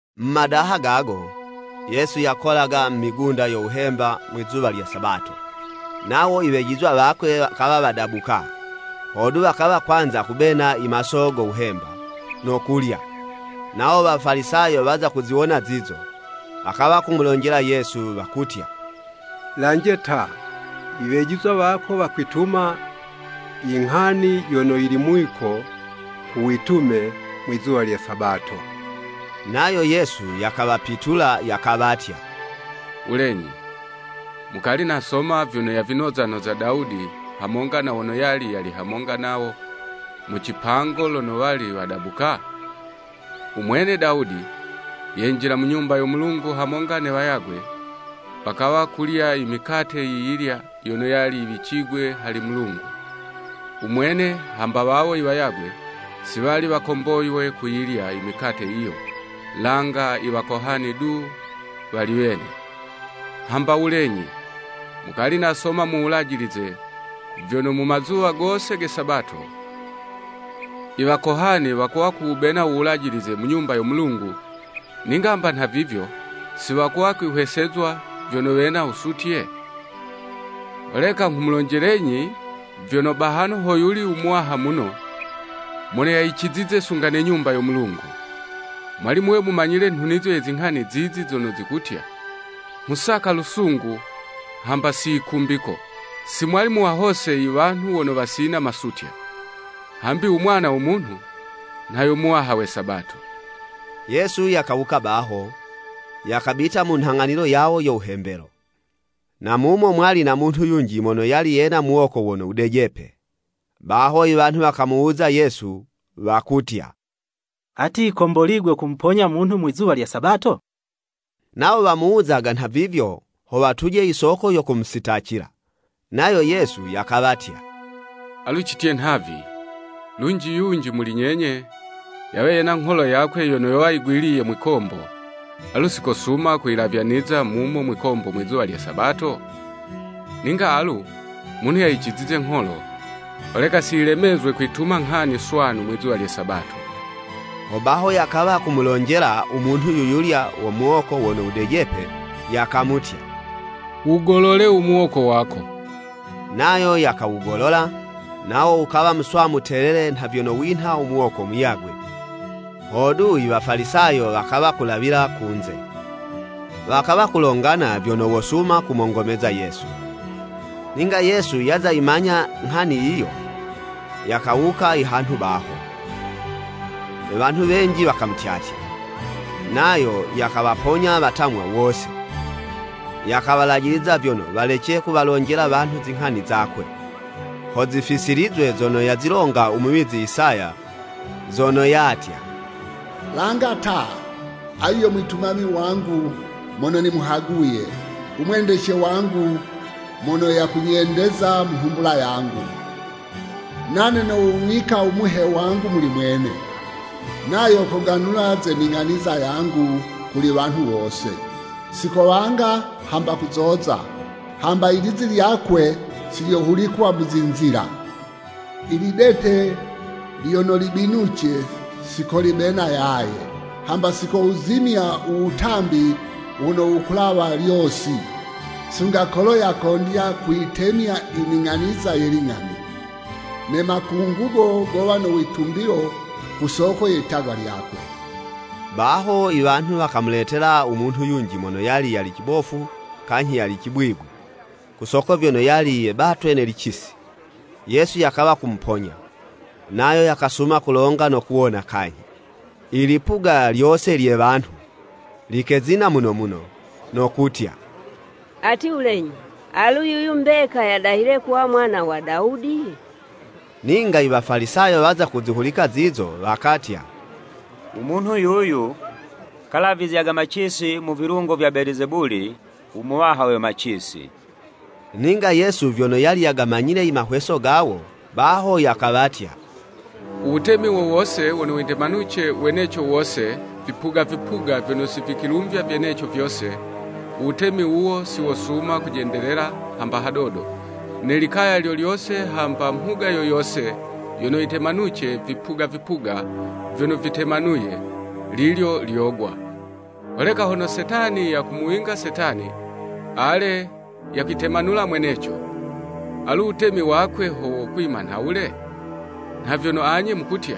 Mu madaha gago, Yesu yakolaga mu migunda yo wuhemba mwizuwa lye Sabato. Nawo i wejizwa wakwe wakawa wadabuka, hodu, wakawa kwanza kubena i maso go wuhemba, no kulya. Nawo Wafalisayo waza kuziwona zizo, wakawa kumulonjela Yesu wakutya, “Lanje ta i wejizwa wako wakwituma i nghani yono yili mwiko ku witume mwi'zuwa lye Sabato.” Nayo Yesu yakawapitula yakawatya, “Wulenyi, mukali nasoma vyono yavinozanoza Dawudi, hamonga na wono yali yali hamonga nawo, mu cipango lono wali wadabuka? U mwene Dawudi, yenjila mu Nyumba yo Mulungu hamonga ne wayagwe, wakawa kulya i mikate yiyilya yono yali yiwicigwe hali Mulungu. U mwene, hamba wawo i wayagwe, si wali wakomboywe kuyilya i mikate yiyo, langa i wakohani du wali wene. Hamba wulenyi, mukali nasoma mu Wulajilize, vyono mu mazuwa gose ge Sabato, i wakohani wakuwa kuwubena u Wulajilize mu Nyumba yo Mulungu, ninga hamba nhavivyo, si wakuwa kwihwesezwa vyono wena wusutye? Holeka nghumulonjelenyi vyono, bahano hoyuli u muwaha muno, mono yayicizize sunga ne Nyumba yo Mulungu. Mwali muwe mumanyile nhunizo ye zinghani zizi zono zikutya, ‘Nghusaka lusungu, hamba si yikumbiko,’ si mwali muwahose i wanhu wono wasina masutya. Hambi u Mwana wo Munhu, nha yo Muwaha we Sabato.” Yesu yakawuka baho, yakabita mu nhang'anilo yawo yo wuhembelo. Na mumo mwali na munhu yunji mono yali yena muwoko wono wudejepe. Baho i wanhu wakamuwuza Yesu wakutya, “Ati, yikomboligwe kumuponya munhu mwizuwa lye Sabato?” Nawo wamuwuzaga nhavivyo, ho watuje i soko yo kumusitacila. Nayo Yesu yakawatya, “Alu citye nhavi, lunji yunji muli nyenye, yawe yena ngholo yakwe yono yowa yigwiliye mwikombo, alu sikosuma kuyilavyaniza mumo mwikombo mwizuwa lye Sabato? Ninga alu, munhu yayicizize ngholo! Holeka si yilemezwe kwituma nghani swanu mwizuwa lye Sabato.” Hobaho yakawa kumulonjela u munhu yuyulya wo muwoko wono wudejepe, yakamutya, “Wugolole u muwoko wako.” Nayo yakawugolola, nawo wukawa muswanu telele nha vyono winha u muwoko muyagwe. Hodu i Wafalisayo wakawa kulawila kunze, wakawa kulongana vyono wosuma kumongomeza Yesu. Ninga Yesu yaza yimanya nghani yiyo, yakawuka i hanhu baho. Ne wanhu wenji wakamutyatya, nayo yakawaponya watamwa wose. Yakawalajiliza vyono walece kuwalonjela wanhu zinghani zakwe, ho zifisilizwe zono yazilonga u muwizi Isaya, zono yatya, “Langa ta, ayu yo mwitumami wangu mono nimuhaguye, u mwendece wangu mono yakunyendeza mu nhumbula yangu. Nane nowuwika u Muhe wangu muli mwene, nayo koganula ze ning'aniza yangu kuli wanhu wose. Si kowanga, hamba kuzoza, hamba i lizi lyakwe, si lyohulikwa mu zinzila. Ilidete lyono libinuce, si kolibena yaye, hamba si kowuzimya u wutambi wono wukulawa lyosi, sunga kolo yakondya kuyitemya i ning'aniza ye ling'ani. Ne makungugo gowa no witumbilo ku soko ye litagwa lyakwe.” Baho i wanhu wakamuletela u munhu yunji mono yali yali cibofu kanyhi yali cibwibwi, ku soko vyono yali yebatwe ne licisi. Yesu yakawa kumuponya, nayo yakasuma kulonga no kuwona kanyhi. Ilipuga lyose lye wanhu, likezina muno muno, no kutya, “Ati, Wulenyi, alu yuyu mbeka yadahile kuwa Mwana wa Dawudi?” Ninga i Wafalisayo waza kuzihulika zizo wakatya, “U munhu yuyu, kagalavizyaga macisi mu vilungo vya Belizebuli u muwaha we macisi.” Ninga Yesu vyono yali yagamanyile i mahweso gawo, baho yakawatya, “U wutemi wo wose wono witemanuce weneco wose vipuga vipuga vyono si vikwilumvya vyeneco vyose, u wutemi wuwo si wosuma kujendelela hamba hadodo, ne likaya lyo lyose hamba mhuga yo yose yono yitemanuce vipuga vipuga vyono vitemanuye, lilyo lyogwa. Holeka hono Setani yakumuwinga Setani, ale, yakwitemanula mweneco. Alu u wutemi wakwe ho wokwima nhawule? Nha vyono anye mukutya,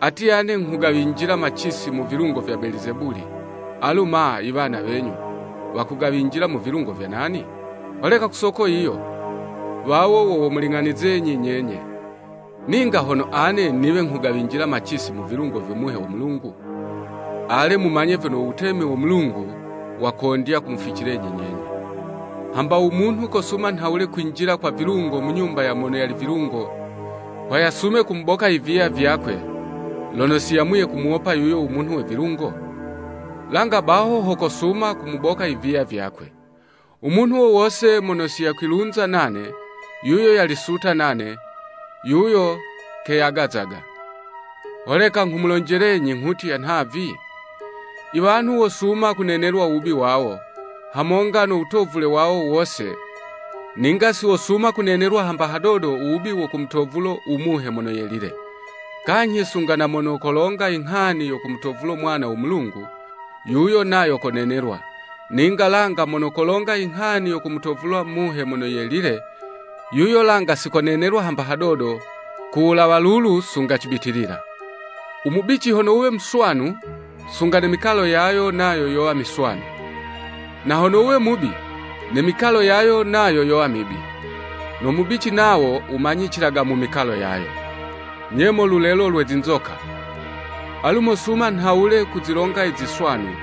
ati ane nghugawinjila macisi mu vilungo vya Belizebuli, alu ma i wana wenyu wakugawinjila mu vilungo vya nani? Holeka ku soko yiyo, wawo wo womuling'anizenyi nyenye. Ninga hono ane niwe nghugawinjila macisi mu vilungo vyo Muhe wo Mulungu, ale, mumanye vyono u Wutemi wo Mulungu wakondya kumuficilenyi nyenye. “Hamba u munhu kosuma nhawule kwinjila kwa vilungo mu nyumba ya mono yali vilungo, ho yasume kumuboka i viya vyakwe, lono si yamuye kumuwopa yuyo u munhu we vilungo? Langa baho ho kosuma kumuboka i viya vyakwe. U munhu wo wose mono si yakwilunza nane, yuyo yali suta nane, yuyo keyagazaga. Holeka nghumulonjelenyi, nghutya nhavi, i wanhu wosuma kunenelwa u wubi wawo, hamonga no wutovule wawo wose, ninga si wosuma kunenelwa hamba hadodo u wubi wo kumutovulo u Muhe Mono Yelile. Kanyhi sunga na mono kolonga i nghani yo kumutovulo Mwana wo Munhu, yuyo nayo konenelwa, ninga langa mono kolonga i nghani ya kumutovulo Muhe Mono Yelile, yuyo langa si konenelwa hamba hadodo ku wulawa lulu sunga cibitilila.” “U mubici hono wuwe muswanu, sunga ne mikalo yayo nayo yowa miswanu, na hono wuwe mubi, ne mikalo yayo yowa mibi. No mubici nawo wumanyicilaga mu mikalo gayo. Nye mo lulelo lwe zinzoka! Alu mosuma nhawule kuzilonga i ziswanu,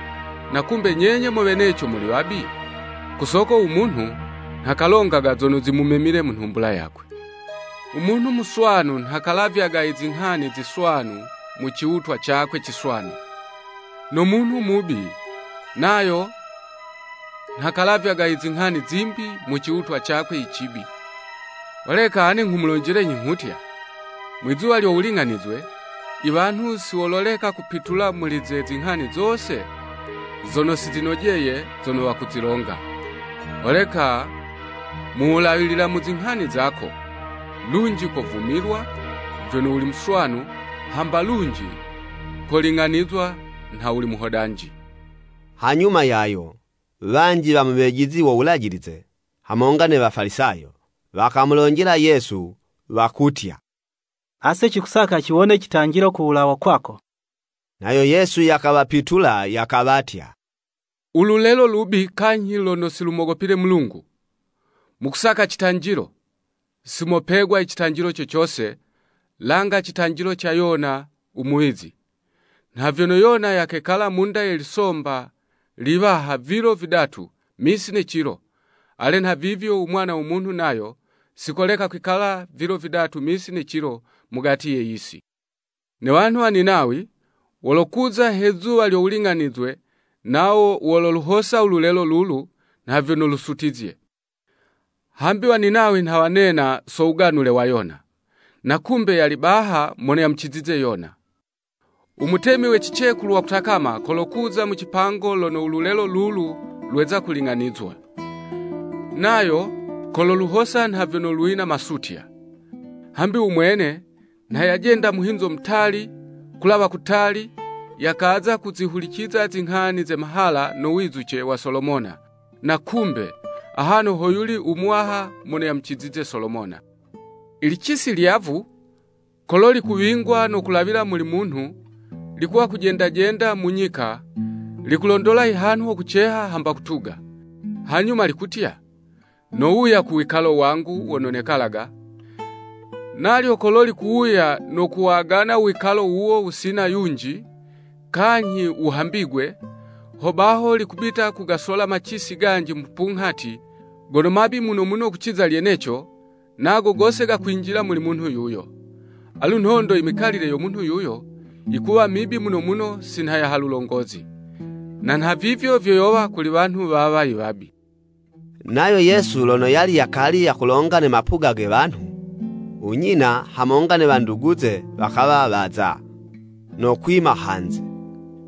na kumbe nyenye mo weneco muli wabi?” Ku soko u munhu, nha kalongaga zono zimumemile mu nhumbula yakwe. U munhu muswanu nha kalavyaga i zinghani ziswanu mu ciwutwa cakwe ciswanu, no munhu mubi nayo, nha kalavyaga izinghani zimbi mu ciwutwa cakwe i cibi. “Holeka ane nghumulonjelenyi, nghutya, Mwizuwa lyo wuling'anizwe i wanhu si wololeka kupitula muli ze zinghani zose zono si zinojeye, zono wakuzilonga. Holeka mu wulawilila mu zinghani zako, lunji kovumilwa vyono wuli muswanu, hamba lunji koling'anizwa nha wuli muhodanji.” Hanyuma yayo, wanji wa mu wejizi wo Wulajilize hamonga ne Wafalisayo, wakamulonjela Yesu wakutya, “Ase cikusaka ciwone citanjilo ku wulawa kwako.” Nayo Yesu yakawapitula yakawatya, “Ululelo lubi kanyhi lono si lumogopile Mulungu! Mukusaka citanjilo, si mopegwa i citanjilo co cose, langa citanjilo ca Yona u muwizi. Nha vyono Yona yakekala mu'nda ye lisomba liwaha vilo vidatu misi ne cilo, ale nha vivyo u Mwana wo Munhu nayo, si koleka kwikala vilo vidatu misi ne cilo mugati ye yisi. Ne wanhu wa Ninawi, wolokuza he zuwa lyo wuling'anizwe nawo walaluhosa u lulelo lulu nha vyono lusutizye. Hambi Waninawi nha wanena, so wuganule wa Yona. Na kumbe yali baha mono yamucizize Yona! U mutemi we cicekulu wa kutakama kolokuza mu cipango lono u lulelo lulu lweza kuling'anizwa, nayo kololuhosa nha vyono lwina masutya. Hambi u mwene nha yajenda muhinzo mutali, kulawa kutali, yakaza kuzihuliciza zinghani ze mahala no wizuce wa Solomona, na kumbe, ahano hoyuli u muwaha mono yamucizize Solomona.” “I licisi lyavu, kolo likuwingwa no kulawila muli munhu, likuwa kujenda jenda mu nyika, likulondola i hanhu ho kuceha, hamba kutuga.” Hanyuma likutya, “Nowuya ku wikalo wangu wono nekalaga. Nalyo kolo likuwuya no kuwagana u wikalo wuwo wusina yunji, kanyhi wuhambigwe, hobaho likubita kugasola macisi ganji mupunghati, gono mabi muno muno kuciza lyeneco, nago gose gakwinjila muli munhu yuyo. Alu nhondo i mikalile yo munhu yuyo, yikuwa mibi muno muno si nha ya halulongozi. Na nhavivyo vyo yowa kuli wanhu wawa i wabi.” Nayo Yesu lono yali yakali yakulonga ne mapuga ge wanhu, u nyina, hamonga ne wanduguze wakawa waza, no kwima hanze,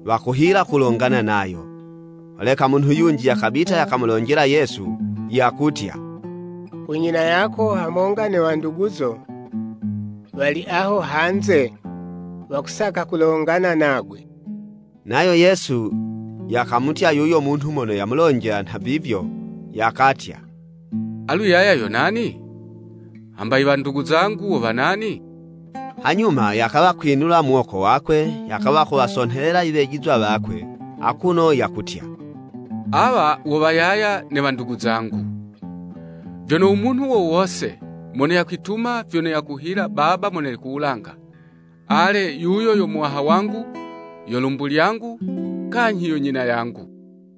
wakuhila kulongana nayo. Holeka munhu yunji yakabita yakamulonjela Yesu yakutya, “U nyina yako hamonga ne wanduguzo, wali aho hanze, wakusaka kulongana nagwe.” Nayo Yesu yakamutya yuyo munhu mono yamulonjela nhavivyo, yakatya, “Alu yaya yo nani? Hamba i wandugu zangu wo wa nani?” Hanyuma yakawa kwinula muwoko wakwe yakawa kuwasonhelela i wejizwa wakwe akuno yakutya, “Awa wo wa yaya, ne wandugu zangu! Vyono u munhu wo wose mono yakwituma nha vyono yakuhila Baba mono yali ku wulanga, ale, yuyo yo muwaha wangu, yo lumbu lyangu, kanyhi yo nyina yangu.”